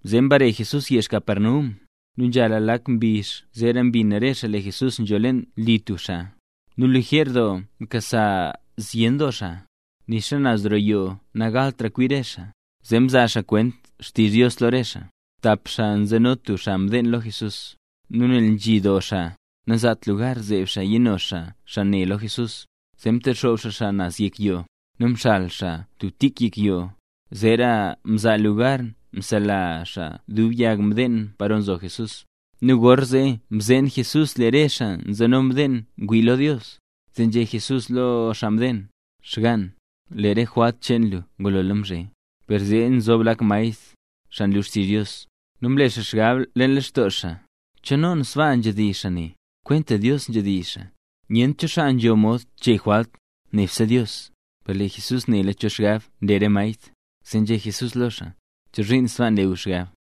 Zee mbare Jesús yezh Capernaum, nu nzhala lak mbizh zeera mbin re xaa lee Jesús nzho leen li tub xaa. Nu lijer doo mkasa zyen doo xaa. Nixa naz roo yoo nagaltra kwi re xaa, zee mzaa xaa kwent xtizh Dios lo re xaa. Tap xaa nzeno tub xaa mdeen lo Jesús. Nu nel nzhi doo xaa, nanzaat lugar zeeb xaa yino xaa xaa ne lo Jesús. Zee mtexoob xaa xaa naz yek yoo. Nu mxal xaa tub tik yek yoo, zeera mzaa lugar msela xaa dub yag mdeen paro nzo Jesús. Nu gorzee mzeen Jesús lee re xaa nzeno mdeen ngwii lo Dios, zee nzhé Jesús lo xaa mdeen: —Xgaan, lee re jwalt cheen lu ngulola mzhe. Per zee nzob lak maestr, xaa nlu xtizh Dios, nu mle xaa xgab leen lextoo xaa: “¿Chonoon sbaa nzhedizh xaa ne? Kwenta Dios nzhedizh xaa. Nyent cho xaa nzho mod chee jwalt, nebse Dios.” Per lee Jesús nela cho xgab nle re maestr, zee nzhé Jesús lo xaa: —¿Chozhiin sbaa nle gu xgab?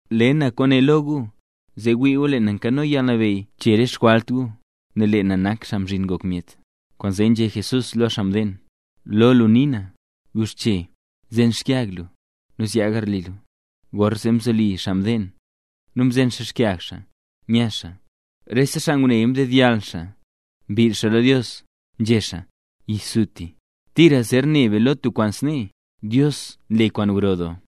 Le na kwaane lo gu, zee wii gu lee na nkano yalnabeyy chee re xjwalt gu, nel lee na nak Xaa Mzhin Ngok Myet. Kwaanzee nzhé Jesús lo xaa mdeen: —Guxche. Zen xkyag lu, nu zyaa garli lu. Gorzee mzoli xaa mdeen, nu mzen xaa xkyag xaa, nya xaa. Rese xaa nguneya ndedyall xaa, mbill xaa lo Dios, nzhé xaa: —¡Yisutisuti! ¡Tira zer ne be lo tub kwaan snee! ¡Dios nle kwaan gro doo!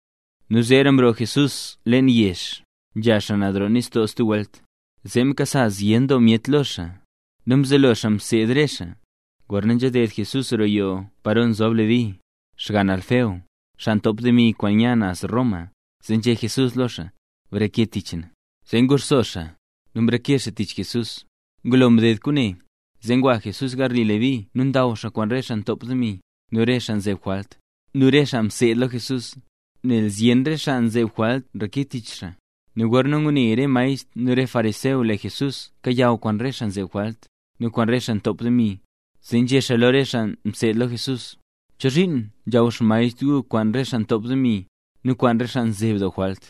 Nu zeera mroo Jesús leen yezh, nzha xaa naz roo nistoo stub welt, zee mkasa zyen doo myet lo xaa. Nu mzelo xaa mseed xaa re xaa. Gorna nzhaded Jesús roo yoo paro nzob Leví, xgann Alfeo, xaa ntop demi kwaan nya naz Roma, zee nzhé Jesús lo xaa: —Breke tich na. Zee nguxso xaa, nu mreke xaa tich Jesús. Ngulo mded kwaane, zee ngwa Jesús garli Leví nu ndaw xaa kwaan re xaa ntop demi, nu re xaa nzeb jwalt, nu re xaa mseed lo Jesús, nel zyen re xaa nzeb jwalt nreke tich xaa. Nu gorna ngune re maestr nu re fariseo lee Jesús kayaw kwaan re xaa nzeb jwalt, nu kwaan re xaa ntop demi, zee nzhé xaa lo re xaa mseed lo Jesús: —¿Chozhiin nzhaw xmaestr gu kwaan re xaa ntop demi, nu kwaan re xaa nzeb doo jwalt?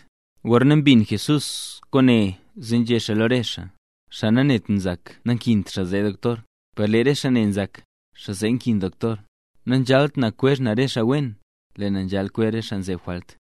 Gorna mbin Jesús kwaane zee nzhé xaa lo re xaa: —Xaa nanet nzak, nankint xaa zee doktor, per lee re xaa ne nzak, xaa zee nkin doktor. Nanzhalt na kwezh na re xaa wen, lee na nzhal kwezh re xaa nzeb jwalt.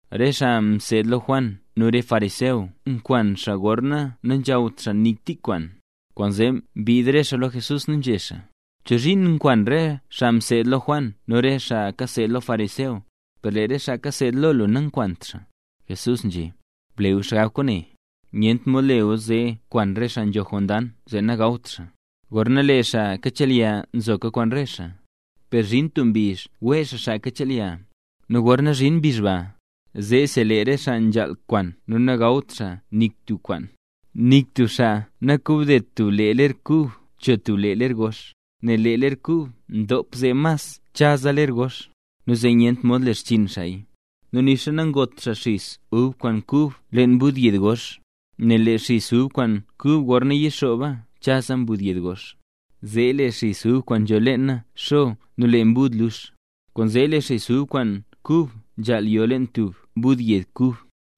Re xaa mseed lo Juan nu re fariseo nkwan xaa gorna nanzhawt xaa nik tik kwaan, kwaanzee mbiid re xaa lo Jesús nu nzhé xaa: —¿Chozhiin nkwan re xaa mseed lo Juan nu re xaa kaseed lo fariseo, per lee re xaa kaseed lo lu nakwant xaa? Jesús nzhé: —Ble gu xgab kwaane. Nyent mod le gu zee kwan re xaa nzho jondang zee nagawt xaa, gorna lee xaa kachelya nzoka kwaan re xaa. Per zhin tub mbizh wee xaa xaa kachelya; nu gorna zhin mbizh ba, zeesi lee re xaa nzhaal kwan nu nagawt xaa nik tub kwaan. ’Nik tub xaa nakobdet tub lee ler kub cho tub lee ler gox, nel lee ler kub ndop zee mas chaza ler gox, nu zee nyentra mod le xchiin xaaya. Nu nixa nangot xaa xis ub kwaan kub leen mbud yed gox. Nel lee xis ub kwaan kub gorna yixooba chaza mbud yed gox. Zee lee xis ub kwaan nzho leena xo nu lee mbud lux. Kwaanzee lee xis ub kwaan kub nzhaal yo leen tub mbud yed kub.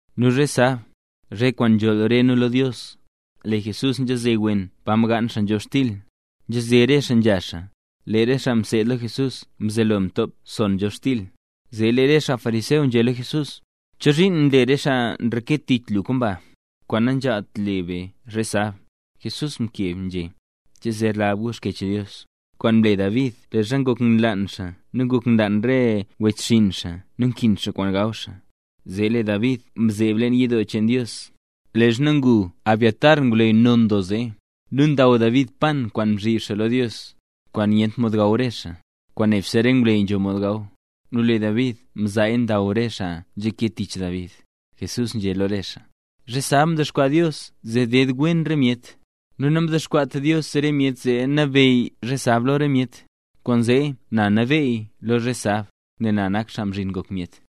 Nu zhe sab, zhe kwaan nzholl re nu lo Dios, lee Jesús nzhaze wen pa mgaan xaa nzhobxtil. Nzhaze re xaa nzha xaa, lee re xaa mseed lo Jesús mzelo mtop son nzhobxtil. Zee lee re xaa fariseo, nzhé lo Jesús: —¿Chozhiin nle re xaa nreke tich lu kwaan ba, kwaan nanzhaalt le be zhe sab? Jesús mkeb nzhé: —¿Che zer lab gu Xkyech Dios, kwaan mle David leezha ngok nlaan xaa nu ngok nlaan re wechxinn xaa nu nkin xaa kwaan gaw xaa? Zee lee David mzeeb leen yidoo cheen Dios, leezha ngu Abiatar ngwleyy non doo zee, nu ndaw David pan kwaan mzhib xaa lo Dios, kwaan nyent mod gaw re xaa, kwaan nebse re ngwleyy nzho mod gaw. Nu lee David mzaaya ndaw re xaa nzhake tich David. Lee Jesús nzhé lo re xaa: —Zhe sab mdexkwaa Dios zee deed wen re myet, nu namdexkwaat Dios re myet zee nabeyy zhe sab lo myet. Kwaanzee na nabeey lo zhe sab, nel na nak Xaa Mzhin Ngok Myet.